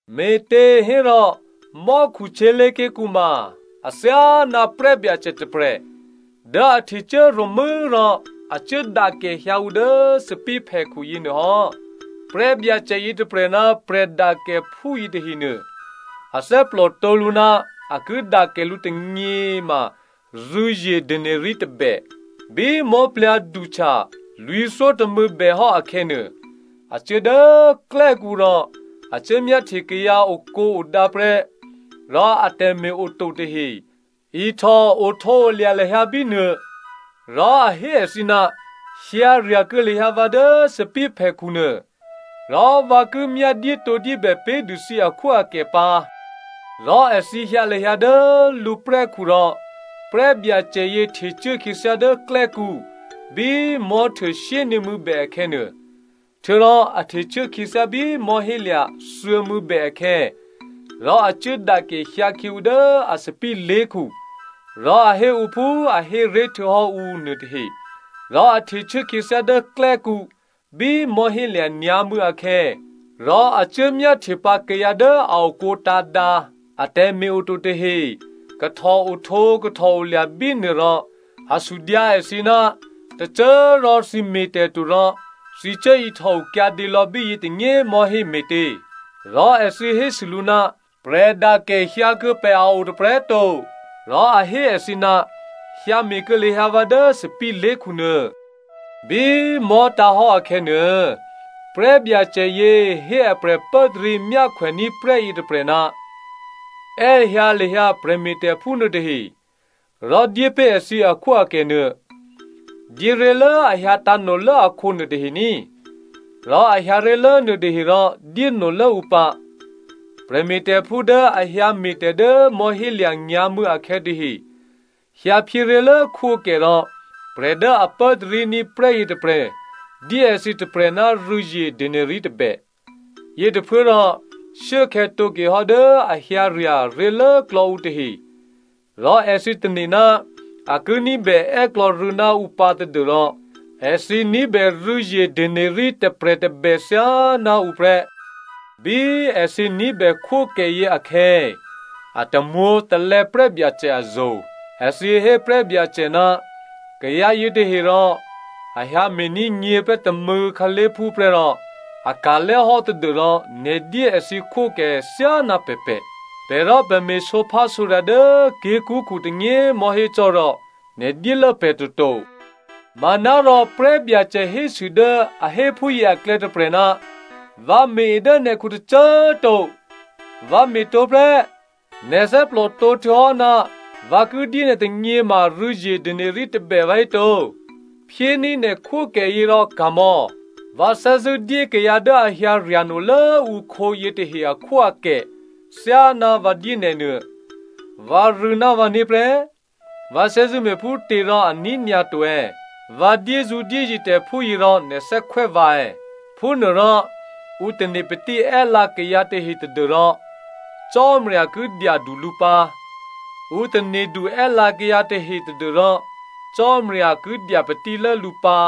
“Me̤těhérò, mò́khu htyělé̤ké̤kǔ ma athyáná prè́byacè tôprè̤ dố a htecuố ro̤mû́ rò a cuố dakè hyǎ ǔ dố a thòbǐthèphèkhu yěnuôhò́. Prè́byacè yětôprè̤ ná prè̤dakèephú yětahenuô, a thè́plòtǒ lǔ ná a ki dakè lǔ tônyě ma rû̌zye denari tôbè. “Bí mò̤́plyǎ̤sè̌htya lwǐ̤thyótômû̌ bèhò́ akhè̌nuô, a cuố dố klè́kǔ rò a cuố myáhtye kayǎ okǒodǎ prè́ rò atè̤me̤ oto tahe ihtò ohtǒolya̤ lahyǎ bínuô. Rò a hé èthǐ, ‘Hyǎ rya̤kuô̌ lahyǎ dố vǎ thòbǐthèphèkhu nuô rò vǎ ki myá dyétǒdyébè pé̤dû thǐ akhwóakè pǎ.’ Rò èthǐ hyǎ lahyǎ dố lǔprè́khu rò prè́byacè yě htecuố khyěthyá dố klè́kǔ bí mò̤́htuô shyényě̤mû̌ bè akhè̌nuô, htuô̌rò a htecuố khyěthyá bí mò̤́hélya̤ thuô̌mû̌bè akhè̌ rò a cuố dakè hyǎkhyě ǔ dố a thòbǐthè lé̤khu rò a hé ǔ phú a hé ré̤ htuô̌hò́ ǔ nuô tahe. Rò a htecuố khyěthyá dố klè́kǔ bí mò̤́hélya̤ nyǎ̤mû̌ akhè̌, rò a cuố myáhtyepǎ kayǎ dố a okǒ tǎ̤dǎ, a tè̤me̤ oto tahe kahtòohtǒ kahtòolya̤ bínuô rò a sudyǎ èthǐ, ‘Tôcô꤮ rò thǐ me̤tè̤to rò thǐ cuố ihtòo kyǎdě lò̌ bíyě tônyě mò̤́hé me̤tě?’ “Rò èthǐ hésû lǔ, ‘Prè̤dakè hyǎkuô̌ pè̤ a o tôprè̤꤮ to.’ “Rò a hé èthǐ, ‘Hyǎme̤ kuô̌ lahyǎ dố vǎ thòbǐthè lé̤khu nuô.’ “Bí mò̤́tǎ̤hò́ akhè̌nuô, prè́byacè yě hé aprè̤ pốtarí myákhwèní̤ prè́ yětôprè̤, ‘È́hyǎ lahyǎ prè̤me̤tè̤phú nuôtahe rò dyépé̤ èthǐ akhwóakè nuô. Dyéré̤lố a hyǎ tǎ̤nolố akhǒ nuôtahe ní, rò a hyǎ ré̤lố nuôtahe rò dyénolố ǔ pǎ.’ “Prè̤me̤tè̤phú dố a hyǎ me̤tè̤ dố mò̤́hélya̤ nyǎ̤mû̌ akhè̌ tahe hyǎphyé ré̤lố khwókè rò prè̤ dố a pốtaríní̤ prè́ yětôprè̤ dyé èthǐ tôprè̤ ná rû̌zye denari tôbè. Yětôphuốrò shuốkhè̌ tǒke hò́ dố a hyǎrya̤ ré̤lốklò̌ ǔ tahe rò èthǐ tane̤ ná a ki ní̤bè è́klò̌ rû̌ ná ǔ pǎ tadû́rò èthǐ ní̤bè rû̌zye denari tôprè̤ tôbè thyáná ǔ prè́. Bí èthǐ ní̤bè khwókèyě akhè̌ a tamwǒ̤talè̌ prè́byacè azo̤. Èthǐ hé prè́byacè, ‘Kayǎ yětahe rò a hyǎ me̤ní̤ nyě̤prè́ tômû̌ khǎlé̤phú prè́ rò a ka̤lè́ hò́ tadû́rò nè̤ dyé èthǐ khwókè thyáná pè̤pè̤. Pè̤ rò pè̤ me̤ sǒphásǒrya̤ dố ké̤kṳ́klè̌ tônyě꤮ mò̤́hé cò́ rò nè̤ dyélố pè̤ toto.’ “Manárò prè́byacè hésû dố a hé phúyě aklè̌ tôprè̤, ‘Vǎ me̤-e dố nè̤khu tôcô꤮ to, vǎ me̤ tǒ prè́, nè̤ thè́plòtǒ htuô̌hò́ ná vǎ ki dyé nè̤ tônyě ma rû̌zye denari tôbè vǎhéto? Phyéní̤ nè̤ khwókèyě rò ka̤mò̌. Vǎ thè́zṳ̂́ dyé kayǎ dố a hyǎ rya̤nolố ǔkhǒ yětahe akhwóakè thyáná vǎ dyé nè̤ nuô. Vǎrû̌ ná vǎné̤ prè́, vǎ thè́zṳ̂́ me̤phútě rò a ní̤nyǎ to è̌? Vǎ dyézǔdyéye̤ tè̤ phúyě rò nè̤ thè́khwè́ vǎ è̌?’ “Phúnuôrò ǔ tane̤ patí è́lǎ kayǎ tahe tadû́rò Cò́marya ki dyadu lǔ pǎ. Ǔ tane̤du è́lǎ kayǎ tahe tadû́rò Cò́marya ki dya patílố lǔ pǎ.”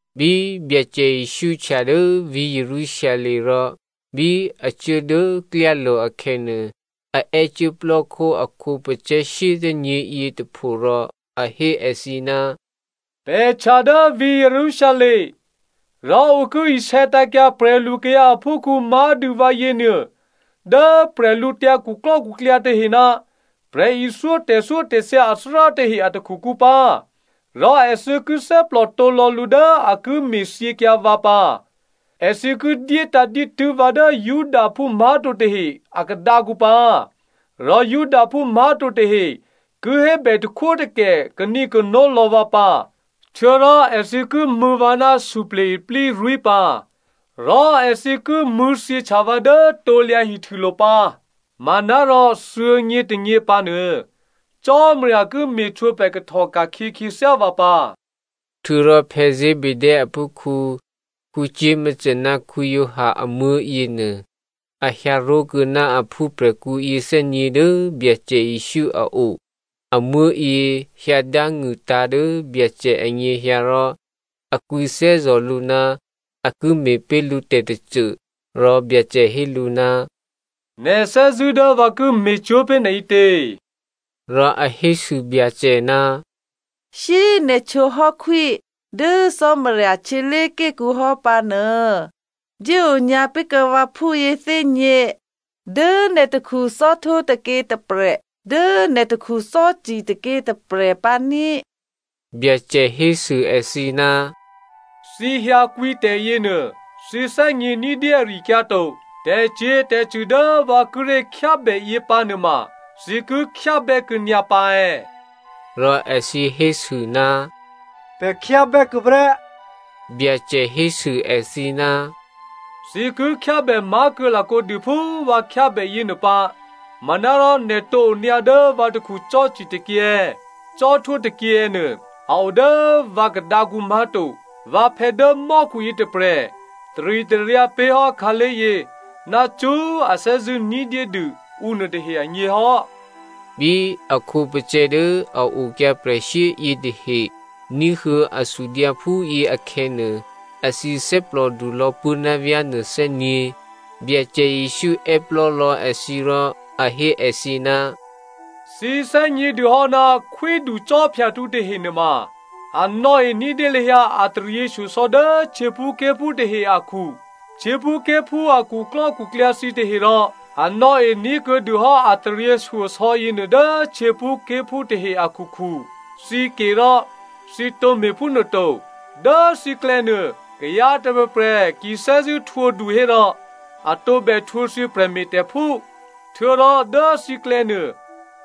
Bí Byacè Jesǔ htya dố vǐ̤ Jerusalem rò bí a cuố dố klyálo̤ akhè̌nuô, a è́cuố plò́khó a khǒpacè̤̌ shyéthè́nyě̤yě tôpho rò a hé èthǐ, “Pè̤ htya dố vǐ̤ Jerusalem, rò ǔ ki isè̌tǎ̤kyǎ prè̤lukayǎ aphúkhǔ má̤dû vǎyěnuô dố bwídukhu tahe ná prè̤ithyó tè̤thyótè̤thya athárá tahe a takhukǔ pǎ. Rò èthǐ ki thè́plò tǒ lò̌ lǔ dố a ki me̤thyěkyǎ vǎ pǎ. Èthǐ ki dyétǎ̤ dǐtû́ vǎ dố Judaphú má̤to tahe a khadǎkǔ pǎ. Rò Judaphú má̤to tahe ki hébè takhwótakè kanǐkano lò̌ vǎ pǎ. Htuô̌rò èthǐ ki mṳ̂̌ vǎ ná suplye̤ iplírwí̤ pǎ rò èthǐ ki mṳ̂̌thyěhtya vǎ dố krusulo̤ pǎ. Manárò thuô̌nyě tônyě pǎnuô Cò́marya ki me̤htwǒprè̤ kahtò ka̤khyě khyěthyá vǎ pǎ.” Htuô̌rò Zebedeo aphúkhǔ Jakomo ná Giovanni amuố̤ yěnuô a hyǎ ró̤kuô̌ ná a phúprè̤khǔ yěthè́nyě̤ dố Byacè Jesǔ a o. Amuố̤yě hyǎ dángṳ̂tǎ̤ dố Byacè anyěhyǎ rò a kwǐthè́zò̤ lǔ ná a ki me̤ pé̤ lǔ tè̤tôcô. Rò Byacè hé lǔ, “Nè̤ thè́zṳ̂́ dố vǎ ki me̤cwó̤ pé̤ nè̤ ǐtě?” Rò a hésû Byacè, “Shyé꤮ nè̤ htwǒ hò́ khwí dố Cò́marya htyělé̤ké̤kǔ hò́ pǎnuô dyéonyǎ pé̤kuô̌ vǎphú yěthè́nyě̤ dố nè̤ takhu cò́htwó tôkyě tôprè̤, dố nè̤ takhu cò́ci tôkyě tôprè̤ pǎ ní꤮.” Byacè hésû èthǐ, “Thǐ hyǎkwǐ tè̤yěnuô thǐ thè́gně ní̤dyé ari-akyǎ to. Tè̤cyě̤tè̤cṳ̂ dố vǎ kíré̤ khyábè yě pǎnuôma thǐ ki khyábè́ kuô̌nyǎ pǎ è̌?” Rò èthǐ hésû, “Pè̤ khyábè́ kuô̌ prè́.” Byacè hésû èthǐ, “Thǐ ki khyábè má̤ kuô̌ lakǒ dû phú vǎ khyábè yěnuô pǎ. Manárò nè̤ tǒ onyǎ dố vǎ takhu cò́ci tôkyě è̌, cò́htwó tôkyě è̌ nuô a o dố vǎ khadǎkǔ má̤to. Vǎphè̌ dố mò́khu yětôprè̤ taritaryǎ pé̤ hò́ khǎlé̤yě ná cṳ́꤮ a thè́zṳ̂́ dyé ní̤dû ǔnuôtahe agně hò́.” Bí a khǒpacè̤̌ dố a okyǎ prè̤shyé yětahe ní̤huô̌ a sudyǎ phúyě akhè̌ nuô, èthǐ thè́plòdu lò̌ puố̤ ná vyá̤ nuô thè́nyě̤. Byacè Jesǔ è́plò́lò̌ èthǐ rò a hé èthǐ, “Thǐ thè́gnědû hò́ ná khwíducò́phyahtǔ tahe nuôma a nò̌e ní̤dyé lahyǎ a taryěshyosò̌ dố htyěphúké̤phú tahe akhu. Htyěphúké̤phú a khuklò́khuklyǎ thǐ taherò a nò̌e ní̤kuô̌dûhò́ a taryěshyosò̌ yěnuô dố htyěphúké̤phú tahe akhukhu. Thǐ ke rò thǐ tǒ me̤phúnuô to. Dố thǐklè̌nuô, kayǎ tôprè̤prè̤ ki thè́zṳ̂́ htwǒdu hérò a tǒbè htwǒ thǐ prè̤me̤tè̤phú. Htuô̌rò dố thǐklè̌nuô,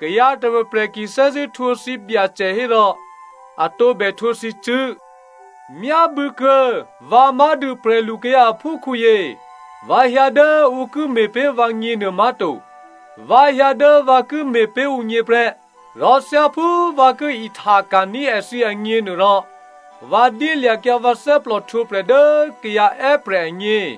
kayǎ tôprè̤prè̤ ki thè́zṳ̂́ htwǒ thǐbyacè hérò a tǒbè htwǒ thǐcṳ̂́. Myábû̌kuô̌ vǎ má̤dû prè̤lukayǎ aphúkhǔyě, vǎ hyǎ dố ǔ ki me̤pé̤ vǎgně nuô má̤to. Vǎ hyǎ dố vǎ ki me̤pé̤ ǔgně prè́. Rò thyáphú vǎ ki ihtaka̤ní̤ èthǐ agněnuôrò, vǎ dyélya̤kyǎ vǎ thè́plò htwǒprè̤ dố kayǎ è́prè̤ agně.”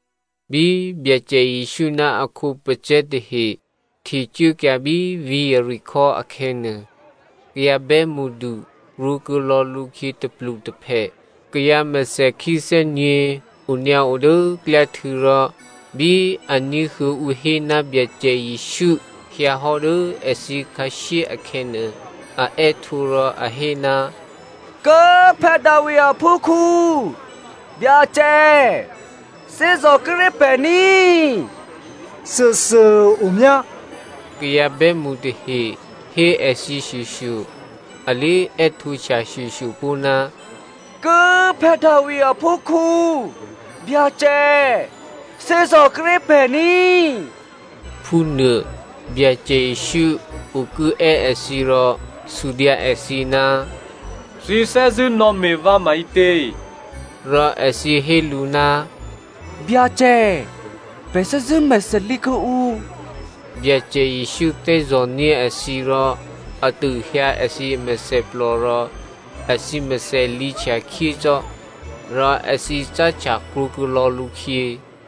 Bí Byacè Jesǔ ná a khǒpacè̤̌ tahe htecuốkyǎ bí vǐ̤ Jeriko akhè̌nuô, kayǎ bè́mṳdu krwǒkuô̌ lò̌ lǔkhyě tôplutôphè. Kayǎ mèthèkhí thè́nyě̤ onyǎo dố klyáhtû̌ rò bí a ní̤huô̌ ǔ hé ná Byacè Jesǔ hyǎhò́ dố èthǐ khǎshyé akhè̌nuô, a è́htǒ rò a hé, “Kố꤮ Davi aphúkhǔ, Byacè꤮, thè́zò̤ kuô̌ ré̤ pè̤ ní꤮.” “Thuôthuô꤮ omyá,” kayǎ bè́mṳ tahe hé èthǐ shyoshyo, a lé è́htǒhtya shyoshyo pó̤, “Kố꤮ Davi aphúkhǔ, Byacè꤮, thè́zò̤ kuô̌ ré̤ pè̤ ní꤮,” phúnuô. Byacè Jesǔ okuố è́ èthǐ rò sudyǎ èthǐ, “Thǐ thè́zṳ̂́ nò̌me̤ vǎ maǐtě?” Rò èthǐ hé lǔ, “Byacè, pè̤ thè́zṳ̂́ mèthèlǐ kuô̌ǔ.” Byacè Jesǔ thè́zò̤ní̤ èthǐ rò a tôhyǎ èthǐ mèthèplò rò èthǐ mèthè lǐhtya khyé cò́. Rò èthǐ cáhtya krwǒkuô̌ lò̌ lǔkhyě.